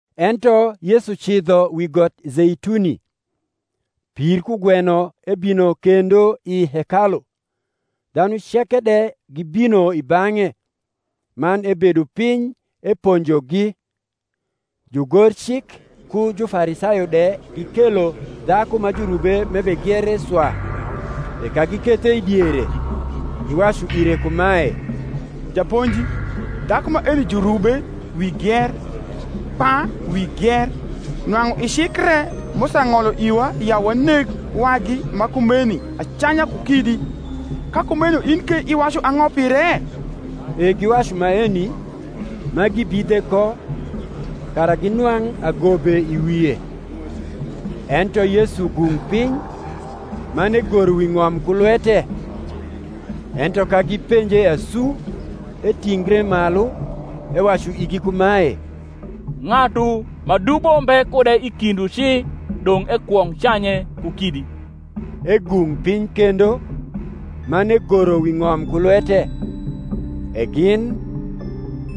Ento Yesu cidho wi got Zeituni. Pir kugweno ebino kendo i hekalu, dhanu ceke de gibino i bang’e; man ebedo piny eponjogi. Jugorcik ku Jufarisayo de gikelo dhaku ma jurube m’ebegiere swa; e ka gikethe i diere, giwacu ire kumae, Japonji, dhaku maeni jurube wi gier, kpa wi gier. Nwang’u i cik re Musa ng’olo iwa ya waneg wagi ma kumeni acanya ku kidi; ka kumeno in ke iwacu ang’o pire? E giwacu maeni, ma gibidhe ko, kara ginwang’ agobe i wie. Ento Yesu gung’ piny, man egoro wi ng’om ku lwete. Ento ka gipenje asu, etingre malu, ewacu igi kumae, Ng’atu ma dubo mbe kude i kindwu ci, dong’ ekwong’ canye ku kidi. Egung’ piny kendo, man egoro wi ng’om ku lwete. E gin,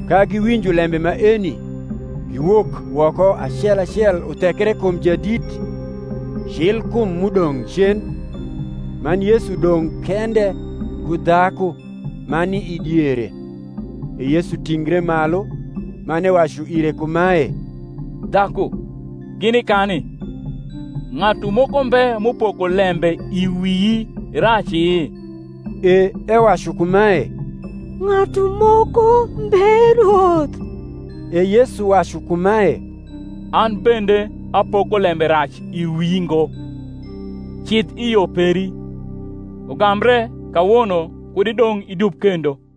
ka giwinjo lembe maeni, giwok woko acel acel uthekre kum jadit, cil kum m’udong’ cen: man Yesu dong’ kende, ku dhaku, ma ni i diere. E Yesu tingre malu, man ewacu ire kumae, Dhaku, gini kani? ng’atu moko mbe m’upoko lembe i wii raci? E ewacu kumae, Ng’atu moko mbe Rwoth. E Yesu wacu kumae, An bende apoko lembe rac i wii ngo: cidh i yo peri; ugambre kawono kud idong’ idub kendo.)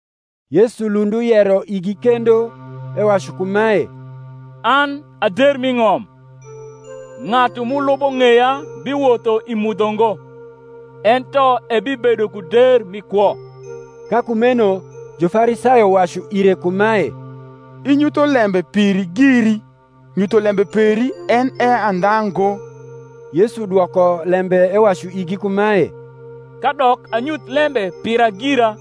Yesu lund uyero igi kendo, ewacu kumae, An a der m’i ng’om; ng’atu m’ulubo ng’eya biwotho i mudho ngo, ento ebibedo ku der mi kwo. Ka kumeno Jufarisayo wacu ire kumae, Inyutho lembe piri giri; nyutholembe peri en e andha ngo. Yesu dwoko lembe ewacu igi kumae, Kadok anyuth lembe pira gira,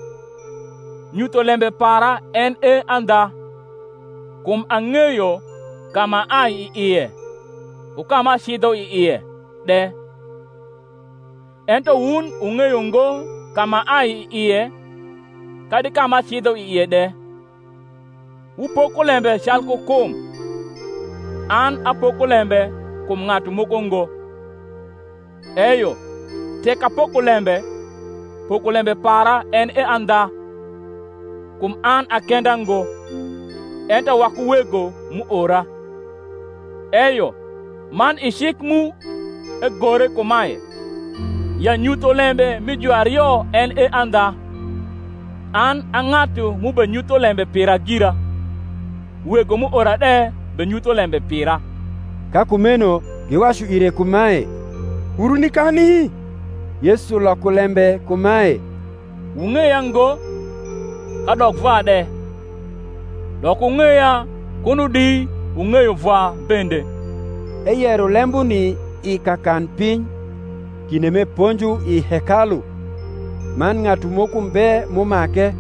nyutholembe para en e andha; kum ang’eyo ka m’aai i ie, ku ka m’acidho i ie de; ento wun wung’eyo ngo ka m’aai i ie, kadi ka m’acidho i ie de. Wupoko lembe calku kum; an apoko lembe kum ng’atu moko ngo. Eyo tek apoko lembe, pokolembe para en e andha: kum an a kenda ngo, ento waku Wego m’uora. Eyo man i cik mu egore kumae, ya nyutholembe mi juario en e andha. An a ng’atu m’ubenyutho lembe pira gira, Wego m’uora de benyutho lembe pira. Ka kumeno giwacu ire kumae, Wuru nikani? Yesu loko lembe kumae, Wung’eya ngo, kadok Vwa de: dok wung’eya kuno di wung’eyo Vwa bende. Eyero lembuni i kakanpiny, kinde m’eponjo i hekalu: man ng’atu moko mbe m’umake;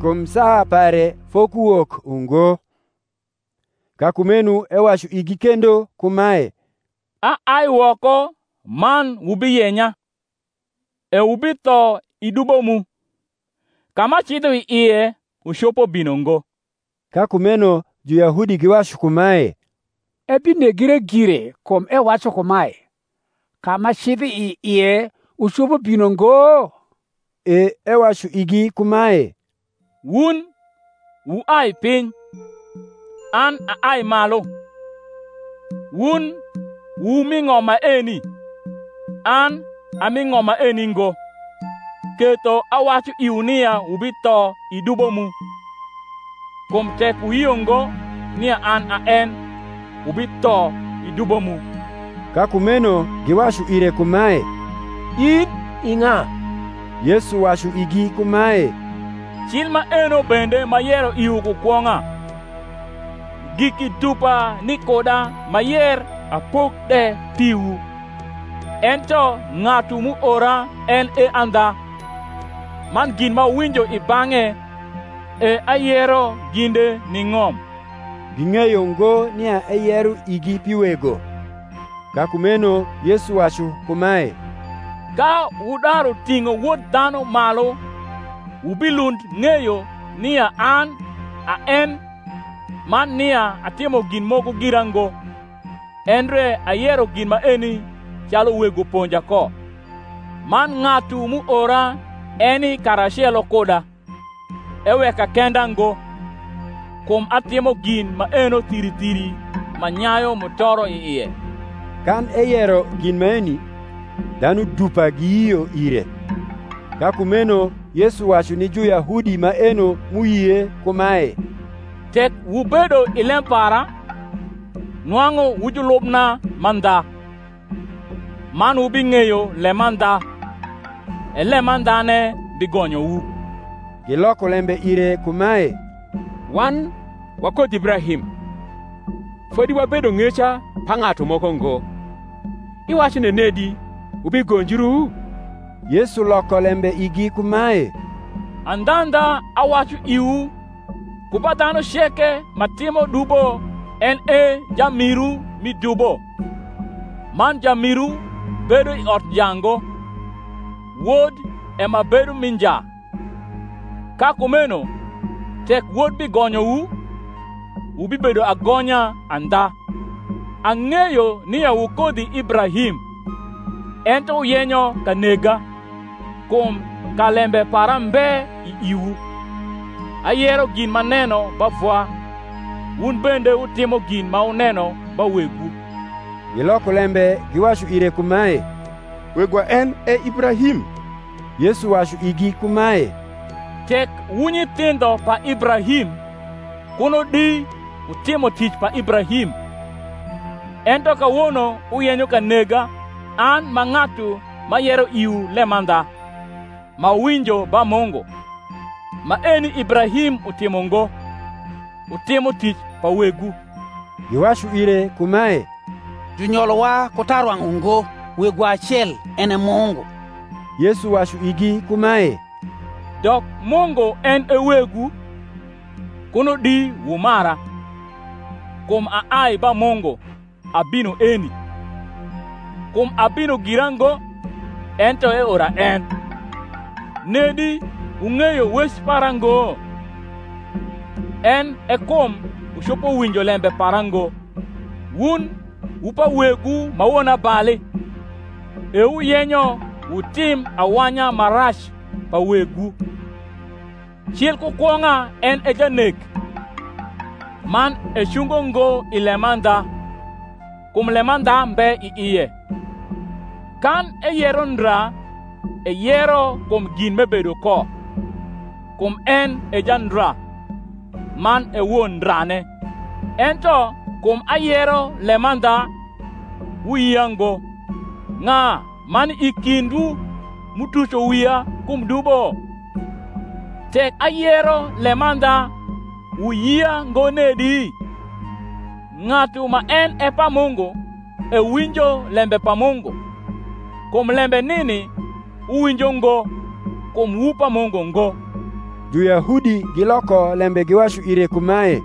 kum saa pare fokuwok ungo. Ka kumeno ewacu igi kendo kumae, Aai woko man wubiyenya, e wubitho i dubo mu: ka m’acidho i ie wucopo bino ngo. Ka kumeno Juyahudi giwacu kumae, Ebinegre gire, kum ewacu kumae, Ka m’acidho i ie, wucopo bino ngo? E ewacu igi kumae, Wun wuai piny; an aai malu: wun wu mi ng’om maeni; an a mi ng’om maeni ngo. Ketho awacu iwu nia wubitho i dubo mu: kum tek wuyio ngo nia an a en, wubitho i dubo mu. Ka kumeno giwacu ire kumae, In i ng’a? Yesu wacu igi kumae, Cil maeno bende m’ayero iwu ku kwong’a. Giki dupa ni kuda m’ayer apok de piwu: ento ng’atu m’uora en e andha; man gin m’awinjo i bang’e, e ayero ginde ni ng’om. Ging’eyo ngo nia eyero igi pi Wego. Ka kumeno Yesu wacu kumae, Ka wudaru ting’o Wod dhanu malu wubilund ng’eyo nia an a en man nia atimo gin moko gira ngo, endre ayero gin maeni calu Wego ponja ko. Man ng’atu m’uora eni karacelo kuda; eweka kenda ngo, kum atimo gin maeno thiri thiri ma nyayu mutoro i ie. Kan eyero gin maeni, dhanu dupa giyio ire. Ka kumeno Yesu wacu ni Juyahudi maeno m’uyie kumae, Tek wubedo i lem para, nwang’u wu julubna mandha; man wubing’eyo lemandha, e lemandhane bigonyowu. Giloko lembe ire kumae, Wan wa kodhi Ibrahim, fodi wabedo ng’eca pa ng’atu moko ngo: iwacu nenedi, Wubigonjru? Yesu loko lembe igi kumae, Andhandha awacu iwu, Ku ba dhanu ceke ma timo dubo en e jamiru mi dubo. Man jamiru bedo i ot nja ngo: wod e ma bedo mi nja. Ka kumeno tek Wod bigonyowu, wubibedo agonya andha. Ang’eyo nia wu kodhi Ibrahim; ento wuyenyo ka nega, kum ka lembe para mbe i iwu. Ayero gin m’aneno ba Vwa: wun bende wutimo gin ma wuneno ba wegwu. Giloko lembe giwacu ire kumae, Wegwa en e Ibrahim. Yesu wacu igi kumae, Tek wu nyithindho pa Ibrahim kuno di wutimo tic pa Ibrahim. Ento kawono wuyenyo ka nega an m’a ng’atu m’ayero iwu lemandha, m’awinjo ba Mungu: maeni Ibrahim utimo ngo. Wutimo tic pa wegwu. Giwacu ire kumae, Junyolowa ku tarwang’ ungo; Wegwa acel, en e Mungu. Yesu wacu igi kumae, Dok Mungu en e Wegwu, kuno di wumara: kum aai ba Mungu abino eni; kum abino gira ngo, ento eora en. Nedi wung’eyo wec para ngo? en e kum wucopo winjo lembe para ngo. Wun wu pa wegwu ma wonabali, e wuyenyo wutim awanya ma rac pa wegwu. Cil ku kwong’a en e janek, man ecungo ngo i lemandha, kum lemandha mbe i ie. Kan eyero ndra, eyero kum gin m’ebedo ko: kum en e jandra, man e won ndrane. Ento kum ayero lemandha, wuyia ngo. Ng’a ma ni i kindwu m’utuco wia kum dubo? Tek ayero lemandha wuyia ngo nedi? Ng’atu ma en e pa Mungu ewinjo lembe pa Mungu: kum lembe nini wuwinjo ngo, kum wu pa Mungu ngo. Juyahudi giloko lembe giwacu ire kumae,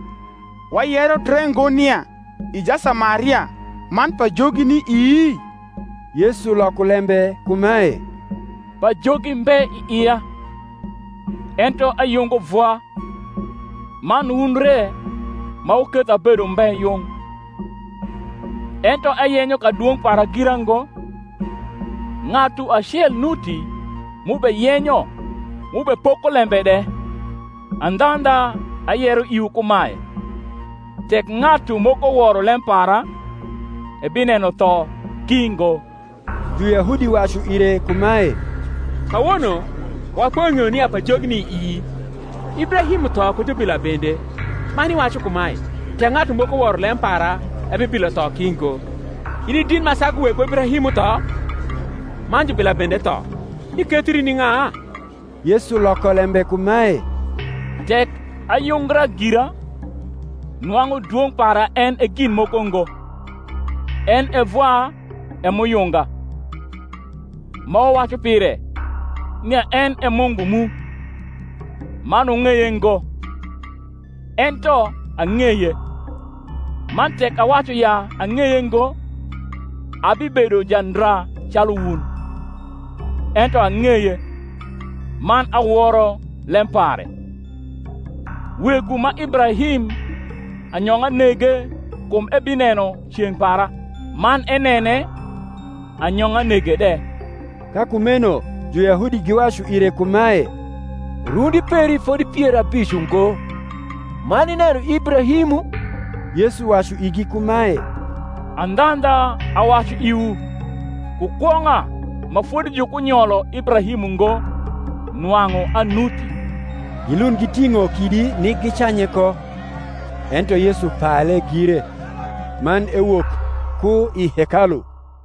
Wayero dre ngo nia i Jasamaria, man pajogi ni ii? Yesu loko lembe kumae, Pajogi mbe i ia; ento ayungo Vwa, man wun re ma wuketho abedo umbe yung. Ento ayenyo kadwong’ para gira ngo: ng’atu acel nuti m’ubeyenyo m’ubepoko lembe de. Andhandha, ayero iwu kumae, Tek ng’atu moko woro lem para, ebineno tho ki ngo. Juyahudi wacu ire kumae, Kawono wapoing’eyo nia pajogi ni ii. Ibrahim utho ku jubila bende; man iwacu kumae, Tek ng’atu moko woro lem para, ebibilo tho ki ngo. In i dit ma sagu wegwa Ibrahim, m’utho? man jubila bende tho: ikethri ni ng’a? Yesu loko lembe kumae, Tek ayungra gira, nwang’u dwong’ para en e gin moko ngo: en e Vwa e m’uyunga: ma wuwacu pire, nia en e Mungu mu; man wung’eye ngo: ento ang’eye; man tek awacu ya ang’eye ngo, abibedo jandra calu wun: ento ang’eye, man aworo lem pare. Wegwu ma Ibrahim anyong’a nege kum ebineno ceng’ para: man enene, anyong’a nege de. Ka kumeno Juyahudi giwacu ire kumae, Rundi peri fodi pier abic ungo, man ineno Ibrahimu? Yesu wacu igi kumae, Andhandha, awacu iwu, Ku kwong’a ma fodi jukunyolo Ibrahim ungo, nwang’u anuti. Gilund giting’o kidi nik gicanye ko: ento Yesu pale gire, man ewok ku i hekalu.